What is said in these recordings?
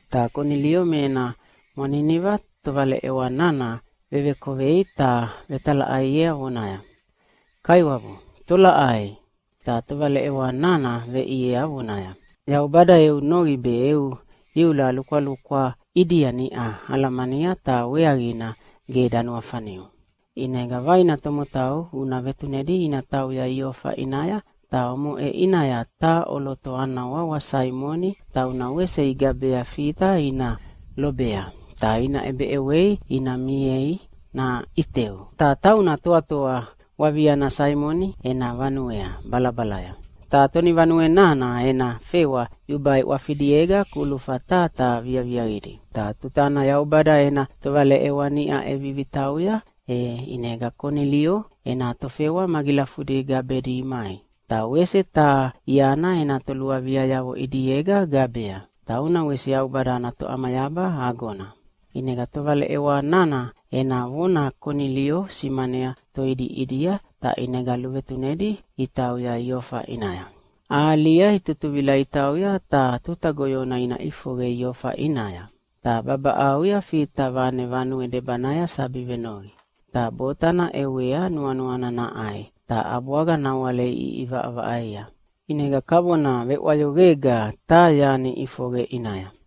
Ta Konilio me ena mwaniniva tovaleʼewa nana vevekovei ta vetalaʼaiea vonaya, “Kaiwabu, tolaʼai?” Ta tovaleʼewa nana veʼiea vonaya, “Yaubada eu noqi be eu iula lukwalukwa ʼidia niʼa alamania, ta weaqina ge danuafaniu. ʼInega vaina tomotau una vetunedi ina tauya Iofa ʼinaya, ta omoʼe ʼinaya taha ʼoloto ana wawa Saimoni tauna wese igabea Fita ina lobea, ta ina ʼebeʼewei ina miei naʼiteu. Ta tauna toatoa waviana Saimoni ena vanuea balabalaya. Ta tonivanue nana ena fewa yubai ʼwafidiega kulufa taha taha viaviaqidi.” Ta tutana Yaubada ena tovaleʼewa niʼa ʼevivi tauya, e ʼinega Konilio ena tofewa magilafudi gabedi imai. Ta wese taha iana ena toluaviayavo ʼidiega gabea, tauna wese Yaubada ana toʼamayaba agona. ʼInega tovaleʼewa nana ena vona Konilio simanea toidi ʼidia, ta ʼinega luvetunedi itauya Iofa ʼinaya. Ahalia itutuvila itautauya ta tuta goyona ina ʼifoqe Iofa ʼinaya. Ta babaʼauya Fita vane vanue debanaya sabi venoqi. Ta botana ʼewea nuanuana naʼai, ta ʼabwaga nawale iʼivaʼavaʼaia. ʼInega kavona veʼwayoqega taha yani ʼifoqe ʼinaya.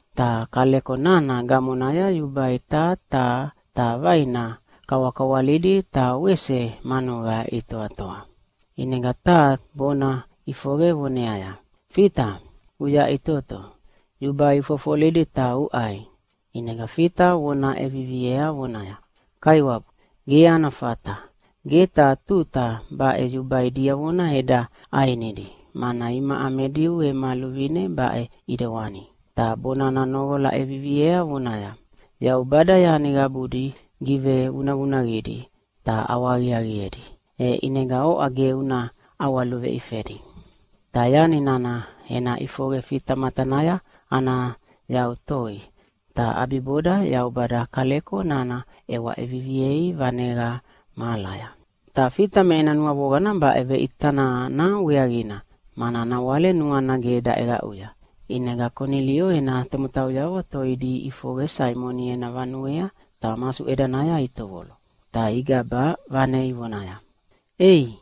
Ta kaleko nana gamonaya yubai taha taha ta vaina kawakawalidi ta wese manuqa itoatoa. ʼInega taha bonana ʼifoqe voneaya, “Fita, uyaʼitoto, yubai ufofolidi ta uʼai!” ʼInega Fita vona ʼeviviea vonaya, “Kaiwabu, gebu ana fata! Ge taha tuta baʼe yubai diavona eda ʼainidi, mana imaʼa me Diu ema luvine baʼe ʼidewani.” Ta bonana noqola ʼeviviea voneaya, “Yaubada yani qabudi givevunavunaqidi ta ʼawahaqiaqiedi, e ʼinega oʼa ge una ʼawaluveifedi.” Ta yani nana ena ʼifoqe Fita matanaya ana yau toi, ta ʼabiboda Yaubada kaleko nana ʼewa ʼeviviei vaneqa mahalaya. Ta Fita me ena nuavoqana baʼe veʼita nana weaqina, mana nawale nuana ge daʼeqaʼuya. ʼInega Konilio ena tomotauyavo toidi iʼifoqe Saimoni ena vanuea ta masuʼedanaya itovolo. Ta igaba vane ivonaya, “Ei,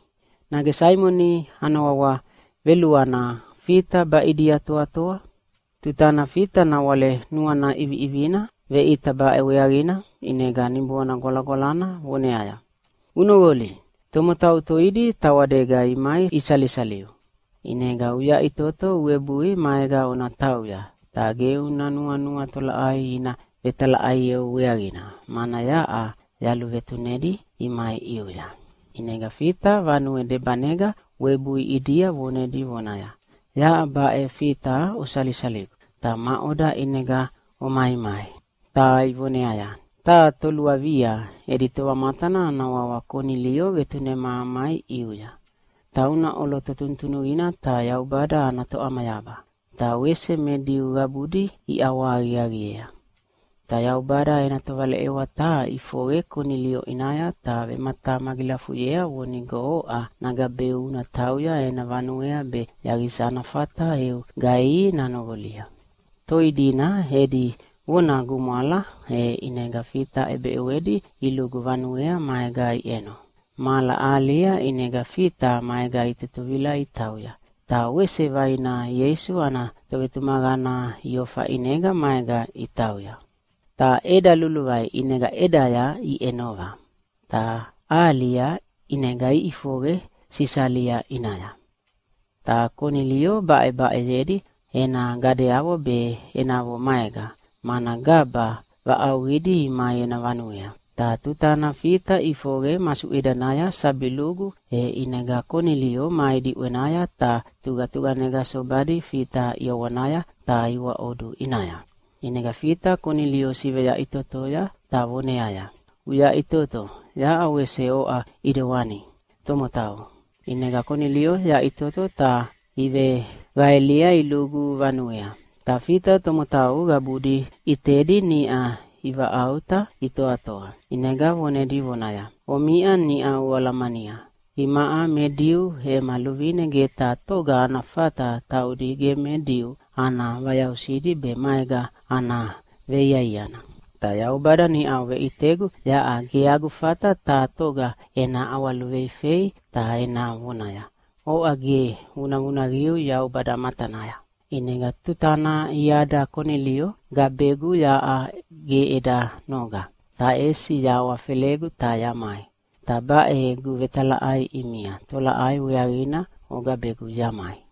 nage Saimoni ana wawa veluana Fita baʼidia toatoa?” Tutana Fita nawale nuana ʼiviʼivina veʼita baʼe weaqina, ʼinega Niboana Gwalagwalana voneaya, “Unoqoli! Tomotau toidi tawadega imai isalisaliu. ʼInega uyaʼitoto uwebui maega ona tauya, ta ge una nuanua tolaʼai ina vetalaʼaieu weaqina, mana yaʼa yaluvetunedi imai ʼiuya.” ʼInega Fita vanue debanega webui ʼidia vonedi vonaya, “Yaʼa baʼe Fita osalisaligu, ta maʼoda ʼinega omaimai?” Ta ivoneaya, “Taha toluavia edi tovamatana ana wawa Konilio vetunema amai ʼiuya. Tauna ʼoloto tunutunuqina ta Yaubada ana toʼamayaba, ta wese me Diu qabudi iʼawahaqiaqiea. Ta Yaubada ena tovaleʼewa taha ʼifoqe Konilio ʼinaya ta vematamagilafuyea vonigo oʼa nagabeu una tauya ena vanuea be yaqisa ana fata eu gaihi nanoqolia.” Toi dina edi vona gumwala, e ʼinega Fita ʼebeʼewedi ilugu vanuea maega iʼeno. Mahala ahalia ʼinega Fita maega itutuvila itauya, ta wese vaina Ieisu ana tovetumaqana Iofa ʼinega maega itauya. Ta ʼeda luluvai, ʼinega ʼedaya iʼenova, ta ahalia ʼinega iʼifoqe Sisalia ʼinaya. Ta Konilio baʼebaʼeyedi ena gadeavo be enavo maega, mana gaba vaʼauqidi imai ena vanuea. Ta tutana Fita ʼifoqe masuʼedanaya sabi lugu, e ʼinega Konilio mai diʼwenaya ta tuqatuqanega sobadi Fita ʼiawanaya ta iwaʼodu ʼinaya. ʼInega Fita Konilio siveyaʼitotoya ta voneaya, “Uyaʼitoto, yaʼa wese oʼa ʼidewani tomotau!” ʼInega Konilio yaʼitoto ta iveqaelia ilugu vanuea, ta Fita tomotau qabudi ʼitedi niʼa ivaʼauta itoatoa. ʼInega vonedi vonaya, “Omiʼa niʼau oalamania, imaʼa me Diu ema luvine ge taha toga ana fata taudi ge me Diu ana vayausidi be maega ana veiaiana. Ta Yaubada niʼau veʼitegu yaʼa ge agu fata taha toga ena ʼawaluveifei ta ena vonaya, “Oʼa ge vunavunaqiu Yaubada matanaya.” ʼInega tutana iada Konilio gabegu yaʼa ge eda noga, ta ʼesi yahawafelegu ta yamai. Ta baʼe egu vetalaʼai ʼimia, tolaʼai weaqina ogabegu yamai?”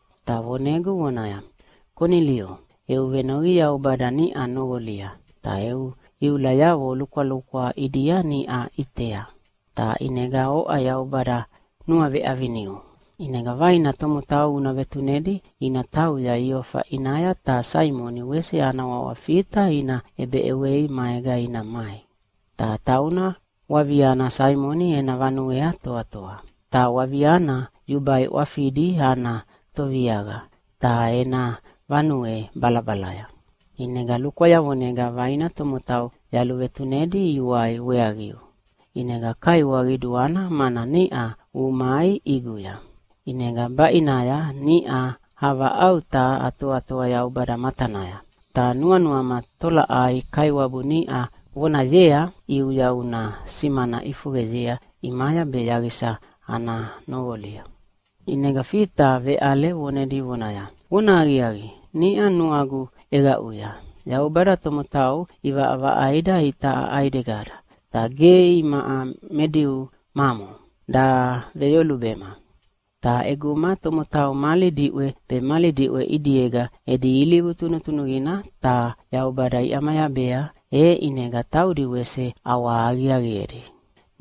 Ta vonegu vonaya, ‘Konilio, eu venoqi Yaubada niʼa noqolia, ta eu iulayavo lukwalukwa ʼidia niʼa ʼitea. Ta ʼinega oʼa Yaubada nuaveʼaviniu. ʼInega vaina tomotau una vetunedi ina tauya Iofa ʼinaya ta Saimoni wese ana wawa Fita ina ʼebeʼewei maega ina mai. Ta tauna waviana Saimoni ena vanuea toatoa. Ta wavianana yubai ʼwafidi ana toviaqa, ta ena vanue balabalaya.’ ʼInega lukwayavonega vaina tomotau yaluvetunedi iwai weaqiu. ʼInega kaiwa qiduana, mana niʼa umai ʼiguya. ʼInega baʼinaya niʼa avaʼauta atoatoa Yaubada matanaya, ta nuanuama tolaʼai Kaiwabu niʼa vonayea ʼiuya una simana ʼifoqeyea ʼimaya be yaqisa ana noqolia.” ʼInega Fita veʼale vonedi vonaya, “Vonahaqiaqi, niʼa nuagu ʼeqaʼuya, Yaubada tomotau ʼivaʼavaʼaida itaʼa ʼaidegada, ta ge imaʼa me Diu mamo daveyolubema. Ta ʼeguma tomotau mali diʼwe be mali diʼwe ʼidiega edi ilivu tunutunuqina ta Yaubada iʼamayabea, e ʼinega taudi wese ʼawaʼawa aqiaqiedi.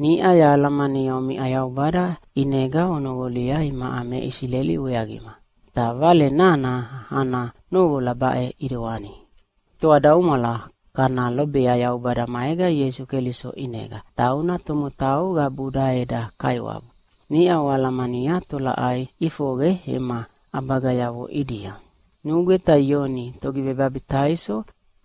Niʼa yahalamania omiʼa Yaubada ʼinega onoqolia imaʼa me Isileli weaqima. Ta vale nana ana noqola baʼe ʼidewani: Toadaumwala kana lobea Yaubada maega Ieisu Keliso ʼinega, tauna tomotau qabuda eda Kaiwabu. Niʼa oalamania tolaʼai ʼifoqe ema ʼabagayavo ʼidia. Nugweta Ioni Togivebabitaiso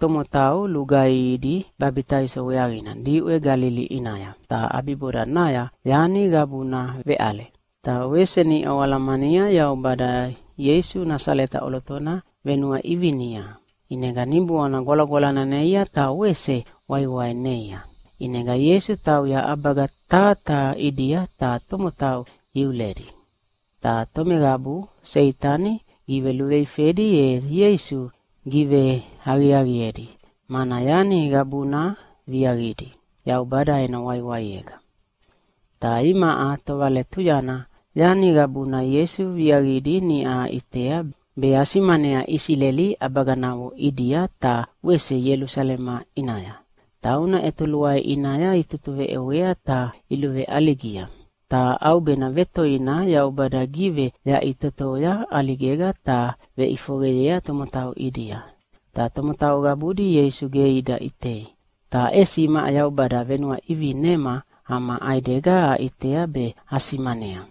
tomotau lugaihidi babitaiso weaqina diʼwe Galili ʼinaya, ta ʼabibodanaya yani qabuna veʼale. Ta wese niʼa oalamania Yaubada Ieisu Nasaleta ʼolotona venuaʼivinia. ʼInega Niboana Gwalagwalana neia ta wese waiwai neia. ʼInega Ieisu tauya ʼabaga taha taha ʼidia ta tomotau iuledi. Ta tomeqabu Seitani giveluveifedi e Ieisu giveaqiaqiedi, mana yani qabuna viaqidi Yaubada ena waiwaiega. Ta imaʼa tovaletuyana yani qabuna Ieisu viaqidi niʼa aʼitea be asimanea Isileli ʼabaganavo ʼidia ta wese Ielusalema ʼinaya. Tauna ʼetoluai ʼinaya itutuveʼewea ta iluveʼaligia. Ta ʼaubena vetoina Yaubada giveyaʼitotoya ʼaligega, ta veʼifoqeyea tomotau ʼidia. Ta tomotau qabudi Ieisu ge ida ʼitei, ta ʼesi imaʼa Yaubada venuaʼivinema ama ʼaidega aʼitea be asimanea.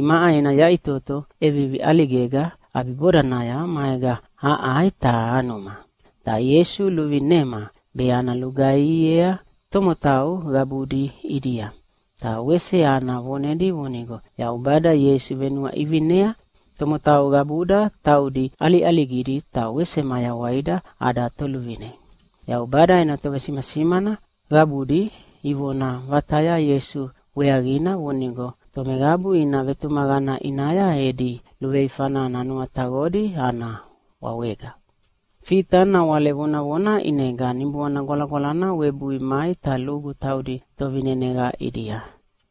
Imaʼa ena yaʼitoto ʼevivi ʼaligega ʼabibodanaya maega aʼai ta anuma. Ta Ieisu luvinema be ana lugaihiea tomotau qabudi ʼidia, ta wese ana vonedi vonigo Yaubada Ieisu venuaʼivinea tomotau qabuda taudi ʼaliʼaligidi ta wese mayawaida ada Toluvine. Yaubada ena tovesimasimana qabudi ivona vataya Ieisu weaqina vonigo tomeqabu ina vetumaqana ʼinaya edi luveifana nanuataqodi ana wawega.” Fita nawale vonavona ʼinega Niboana Gwalagwalana webui mai ta lugu taudi tovineneqa ʼidia.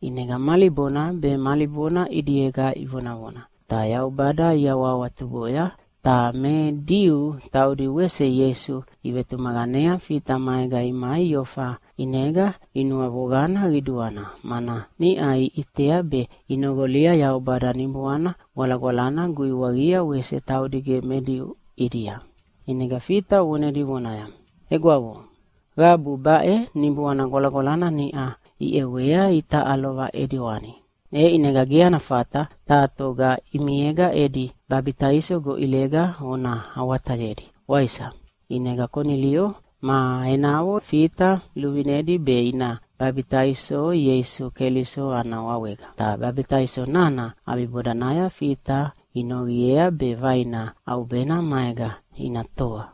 ʼInega mali bona be mali bona ʼidiega ivonavona, ta Yaubada iawahawatuboya. Ta me Diu taudi wese Ieisu ivetumaqanea Fita maega imai Iofa ʼinega inuavoqana qiduana, mana niʼa iʼitea be inoqolia Yaubada Niboana Gwalagwalana guiwaqia wese taudi ge me Diu ʼidia. ʼInega Fita vonedi vonaya, “Egwavo, qabu baʼe Niboana Gwalagwalana niʼa iʼewea itaʼa lova ʼidewani. E ʼinega ge ana fata taha toga ʼimiega edi babitaiso goʼilega ona awatayedi, waisa?” ʼInega Konilio ma enavo Fita luvinedi be ina babitaiso Ieisu Keliso ana wawega. Ta babitaiso nana ʼabibodanaya Fita inoqiea be vaina ʼaubena maega ina toa.